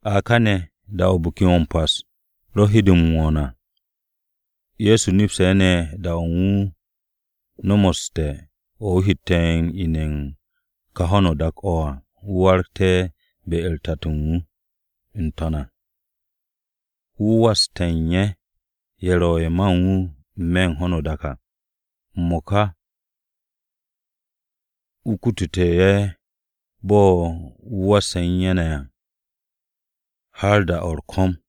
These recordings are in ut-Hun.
A káne̱, da-o̱ Biki-o̱ m-Pas ro u̱n he de m-wo̱o̱n à, Ye̱so nepste̱ ne̱ da-o wooste̱ o̱ wu̱ hette̱ m-ine̱ u̱n ka ho̱no o-dak o̱ wu̱ waragte̱ be-u̱r Tato u̱n wu̱, wu̱ n-To̱n à. Wu̱ waste̱ ye̱, ye̱ ro̱ ye̱ ma u̱n wu̱ n-me̱ u̱n ho̱no o-dak à, m-mo̱ka wu̱ kutute̱ ye̱ bo̱ wu̱ wasse̱ u̱n ye̱ ne̱ à har da-o̱ u̱r-ko̱m.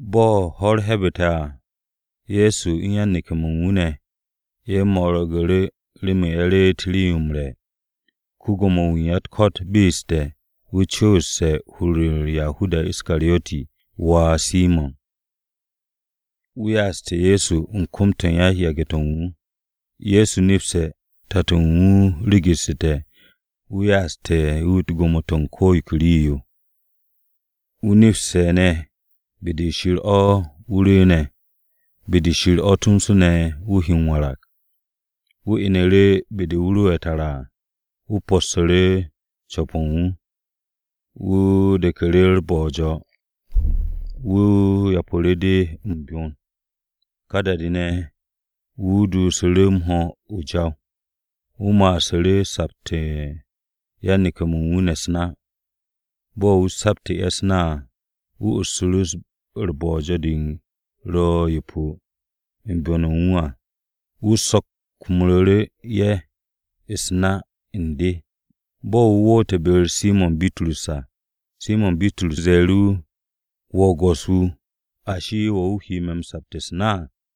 Bo̱ ho̱-u̱r he̱'e̱bu̱te̱ à, Ye̱so ne̱ u̱n yan-neke̱-mo̱ u̱n wu̱ ne̱ ye̱ mo̱rgu̱ru̱ remen ye̱ reet rii-yo m-re̱. Ko-Gwo̱mo-wu̱ u̱n ya-u̱t-ko̱t be'essu̱te̱ wu̱ cu̱wu̱ste̱ u̱n hur-u̱r Yahudas Iskariyoti wà Simo̱n, wu̱ ya'aste̱ Ye̱so u̱n kom-to̱ u̱n yan-yage̱-to̱ u̱n wu̱. Ye̱so nepste̱ Tato u̱n wu̱ be'essu̱te̱ wu̱ ya'assu̱te̱ wu̱ gwo̱mo-to̱ u̱n ko̱ yo ke rii-yo. Wu̱ nepste̱ ne̱ be-de Shir o̱ wu̱ rwu̱u̱ne̱, be-de Shir o̱ tomso ne̱ wu̱ he m-warag. Wu̱ inu̱ru̱ be-de wu̱ ro tara à, wu̱ possu̱ru̱ co̱p-o̱ u̱n wu̱. Wu̱ de̱knu̱ru̱ u̱r-bo̱jo̱, wu̱ yapu̱ru̱ de u̱n byon. Ka da-de ne̱, wu̱ duusu̱ru̱ m-ho̱ o-jaw. Wu̱ ma'asu̱ru̱ u̱n sapte̱ u̱n yan-neke̱-mo̱ u̱n wu̱ u̱s-na. Bo̱ wu̱ saptu̱te̱ ye̱ u̱s-na à, wu̱ ussu̱ru̱ bo̱jo̱-de ro yepo u̱n byon-o̱ u̱n wu̱ à, wu̱ sokmu̱ru̱ ye̱ u̱s-na u̱n de. Bo̱ wu̱ woote̱ be-u̱r Simo̱n Bitrus à, Simo̱n Bitrus ze̱e̱ru̱ wu̱, “Wo̱, Go̱s-wu̱, ashi, ¿wo̱ wu̱ he me̱ sapte̱ u̱s-na?”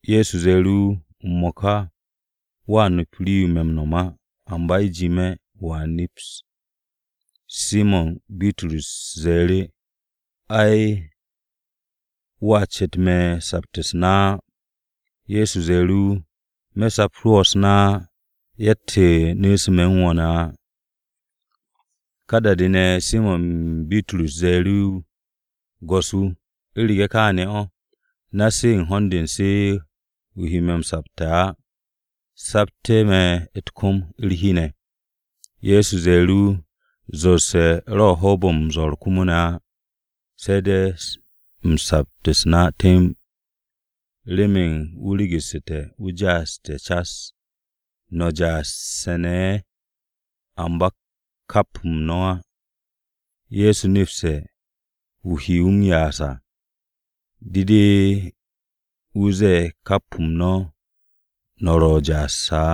Ye̱so ze̱e̱ru̱ wu̱, “M-mo̱ka wo̱ nap rii-yo me̱ m-nom á, amba u̱jime̱ wo̱a neps.” Simo̱n Bitrus ze̱e̱ru̱, “Ay, wo̱a ce̱t me̱ u̱n sapte̱ u̱s-na á.” Ye̱so ze̱e̱ru̱ wu̱, “Me̱ sapte̱ wo̱ ne̱ u̱s-na á, yatt-yo nu̱'u̱se̱ me̱ u̱n wo̱ ne̱ á.” Ka da-de ne̱, Simo̱n Bitrus ze̱e̱ru̱ wu̱, “Go̱s-wu̱, u̱rege̱ kaane̱ o̱, na-se u̱n ho̱n-de u̱n se o he me̱ m-sapte̱ á, sapte̱ me̱ u̱t-kom u̱r-hi ne̱.” Ye̱so ze̱e̱ru̱ wu̱, “Zorse̱-o ro̱ u̱n hoob-o̱ m-zo̱r komo ne̱ á, se̱ de̱ sapt u̱s-na temb, remen wu̱ be'essu̱te̱ wu̱ ja'assu̱te̱ cas cas. No̱ ne̱ ja'asse̱ ne̱ ye̱, amba kap-m no̱ o̱ á.” Ye̱so nepste̱ wu̱ he wu̱ m-ya'as à, de de wu̱ zette̱ kap-m no̱ o̱ no̱ ro̱ ja'asse̱ á.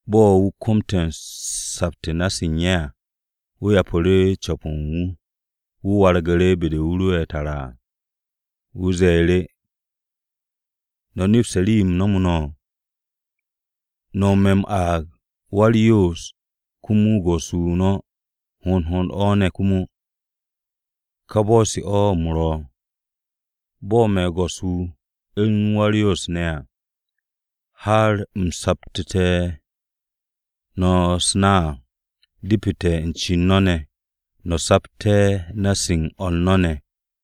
Bo̱ wu̱ komte̱ sapt u̱n na-se u̱n ye̱ à, wu̱ co̱pu̱ru̱ co̱p-o̱ u̱n wu̱. Wu̱ wargu̱ru̱ be-de wu̱ ro'e̱ tara à, wu̱ ze̱e̱ru̱, “¿No̱ nepste̱ rii-yo u̱m nomu̱ no̱? No̱ me̱ m-aag ‘Wa-u̱r-Yoos,’ komo ‘Go̱s-wu̱’ no̱. Hond hond o̱ ne̱ komo. Ka bo̱-se o̱ u̱m ro̱. Bo̱ me̱ Go̱s-wu̱, u̱n Wa-u̱r-Yoos ne̱ à, har u̱m saptu̱te̱ no̱ u̱s-na à, depete̱ u̱n cen no̱ ne̱ no̱ sapt na-u̱s o̱r no̱ ne̱.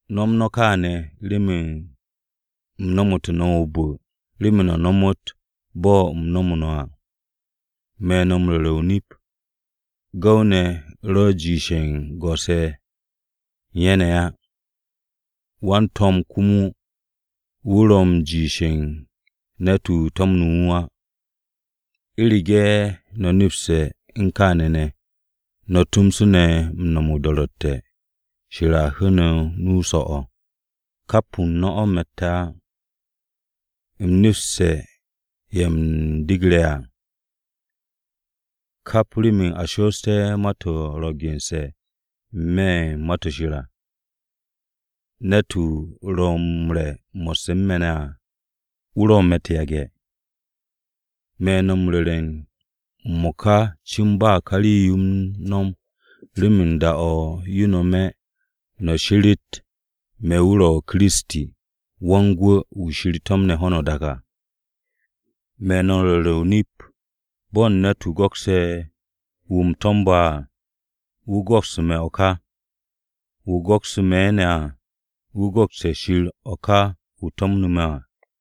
No̱m no̱ kaane̱ remen u̱m nomu̱tu̱ no̱ o-bu̱ remen no̱ nomot bo̱ u̱m nomu̱ no̱ à. Me̱ no̱ m-ru̱re̱ o-nip, gu̱w-ne̱ ro̱ m-jiish u̱n go̱s-ye̱ ye̱ u̱n ye̱ ne̱ á. Wan-to̱m komo wu̱ ro̱ m-jiish u̱n ne̱t-wu̱ to̱mnu̱ wu̱ á. U̱rege̱ no̱ nepste̱ u̱n kaane̱ ne̱, no̱ tomso ne̱ m-no̱m o-do̱ro̱tte̱, Shir a hu̱u̱ no̱ nu so̱-o̱. Kap-m no̱ o̱ me̱tte̱ á. U̱m nepste̱ ye̱ u̱m degre̱ à. Kap remen a shoosté̱ ma-to̱ ro̱ gense̱ n-me̱ u̱n Ma-to̱ Shir à, ‘Ne̱t-wu̱ ro̱ m-re̱ mo̱sse̱ u̱n me̱ ne̱ à, wu̱ ro̱ me̱ u̱t-yage̱.’ “Me̱ no̱ m-ru̱re̱ m-mo̱ka cin ba ka rii-yo u̱n no̱m, remen da-o̱ yo nome̱, no̱ she̱re̱t me̱ wu̱ ro̱ Kiristi, Wan-Gwu̱ wu̱ Shir to̱mne̱ ho̱no o-dak à. Me̱ no̱ m-ru̱re̱ o-nip, bo̱ u̱n ne̱t-wu̱ go̱kse̱ wu̱ u̱m to̱mbe̱ à, wu̱ go̱kste̱ me̱ o̱ ka. Wu̱ go̱kse̱ me̱ ne̱ à, wu̱ go̱kste̱ Shir o̱ ka wu̱ to̱mne̱ me̱ à.”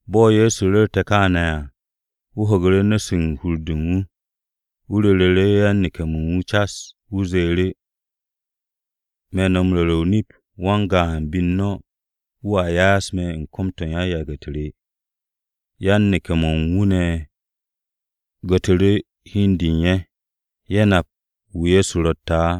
Bo̱ Ye̱so ru̱rte̱ kááne̱ à, wu̱ ho̱gu̱ru̱ u̱s-nu̱ u̱n hur-de u̱n wu̱. Wu̱ ru̱ru̱ yan-neke̱-mo̱ u̱n wu̱ cas, wu̱ ze̱e̱ru̱, “Me̱ no̱ m-ru̱re̱ o-nip, wan-gaan be u̱n no̱, wu̱a ya'as me̱ u̱n kom-to̱ u̱n yan-yage̱-u̱t re.” Yan-neke̱-mo̱ u̱n wu̱ gu̱tru̱ru̱ hi u̱n de u̱n ye̱, ye̱ nap wu̱ Ye̱so ro̱tte̱ á.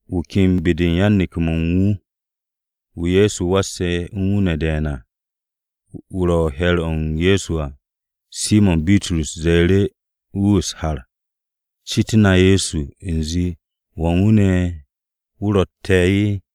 Wu̱ ken be-de u̱n yan-neke̱-mo̱ u̱n wu̱, wu̱ Ye̱so wasse̱ u̱n wu̱ ne̱ de̱e̱n à, wu̱ ro u̱n he̱r-o Ye̱so. Simo̱n Bitrus ze̱e̱ru̱ wu̱ u̱s-har, “Citu̱ na Ye̱so u̱nze, ¿Wan wu̱ ne̱ wu̱ ro̱tte̱?”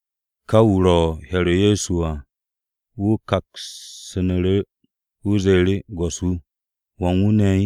Ka wu̱ ro u̱n he̱r-o Ye̱so à, wu̱ kaksu̱nu̱ru̱, wu̱ ze̱e̱ru̱, “Go̱s-wu̱, ¿wan wu̱ ne̱?”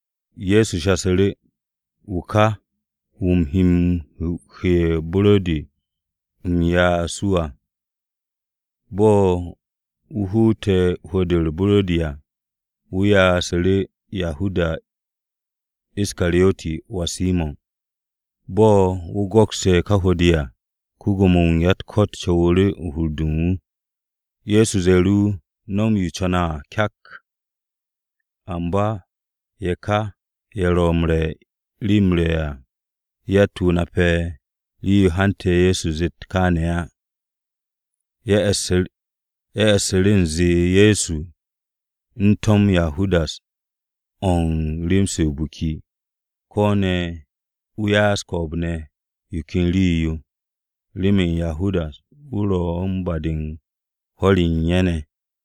Ye̱so shasu̱ru̱, “Wu̱ ka, wu̱ u̱m he m-huwe̱ u̱r-buro̱di u̱m ya'as wu̱ à.” Bo̱ wu̱ huute̱ ne̱ hwu̱-de u̱r-buro̱di à, wu̱ ya'asu̱ru̱ Yahudas Iskariyoti wà Simo̱n. Bo̱ wu̱ go̱kste̱ ka hwu̱-de à, ko-Gwo̱mo-wu̱ u̱n ya-u̱t-ko̱t co̱wu̱ru̱ u̱n hur-de u̱n wu̱. Ye̱so ze̱e̱ru̱ wu̱, “No̱m yo o co̱ne̱ à kyak.” Amba ye̱ ka ye̱ ro̱ u̱n re̱ u̱n rii-yo m-re̱ à yatt-wu̱ nape̱ rii-yo hante̱ Ye̱so zeet wu̱ kááne̱ á. Ye̱ e̱ssu̱ru̱ u̱nze Ye̱so u̱n to̱m Yahudas o̱n rem-se o-biki, ko̱ ne̱ wu̱ ya'as ko̱o̱b-ne̱ yo ken rii-yo, remen Yahudas wu̱ ro u̱n ba-de u̱n hwo̱r-ye̱ u̱n ye̱ ne̱.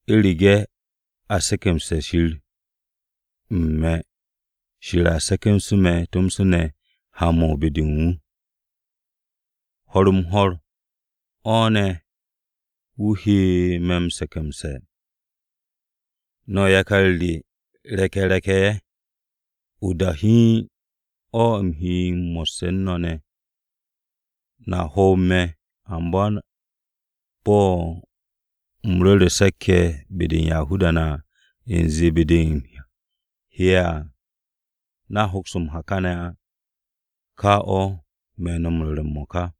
U̱rege̱ a se̱ke̱mse̱te̱ Shir u̱n me̱, Shir a se̱ke̱mse̱ me̱ tomso ne̱ ha-mo̱ u̱n be-de u̱n wu̱. Ho̱r-m-ho̱r o̱ ne̱ wu̱ he me̱ m-se̱ke̱mse̱. “No̱ yakar re re̱k-ye̱ re̱k-ye̱, o-da hiin o̱ u̱m ro̱ mo̱sse̱ u̱n no̱ ne̱. No̱a hoob me̱, amba bo̱ u̱m ru̱re̱ Se̱k-ye̱ be-de u̱n Yahuda-ne̱ u̱nze be-de u̱m he'e̱ à no̱a hoks m-ha káne̱ á, ka o̱ me̱ no̱ m-ru̱re̱ m-mo̱ka.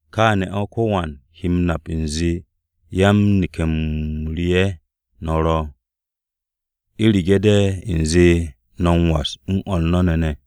Kááne̱ o̱ ko̱wan he m-nap u̱nze yan-neke̱-m re ye̱ no̱ ro̱, u̱rege̱ de̱ u̱nze no̱ m-was u̱n o̱r no̱ ne̱ ne̱.”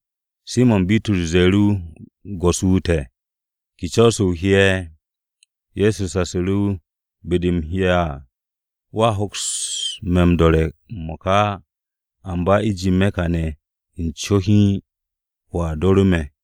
Simo̱n Bitrus ze̱e̱ru̱ wu̱, “Go̱s-wu̱ te̱, ¿ke co̱-o̱ o he?” Ye̱so shasu̱ru̱ wu̱, “Be-de u̱m he'e̱ à, wo̱a hoks me̱ m-do̱re̱ m-mo̱ka á. Amba u̱jime̱ kane̱ u̱n co hiin, wo̱a do̱ru̱ me̱.”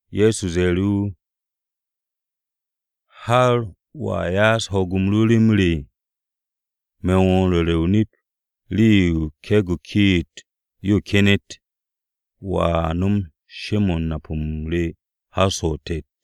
Ye̱so ze̱e̱ru̱, “¿Har wo̱a ya'as ho̱o̱g ru rem re? Me̱ no̱ m-ru̱re̱ o-nip, rii-yo ke̱e̱g-o kiit-yo kenet, wo̱a nom she-mo̱ u̱n nap-o re har so̱ o-tet.”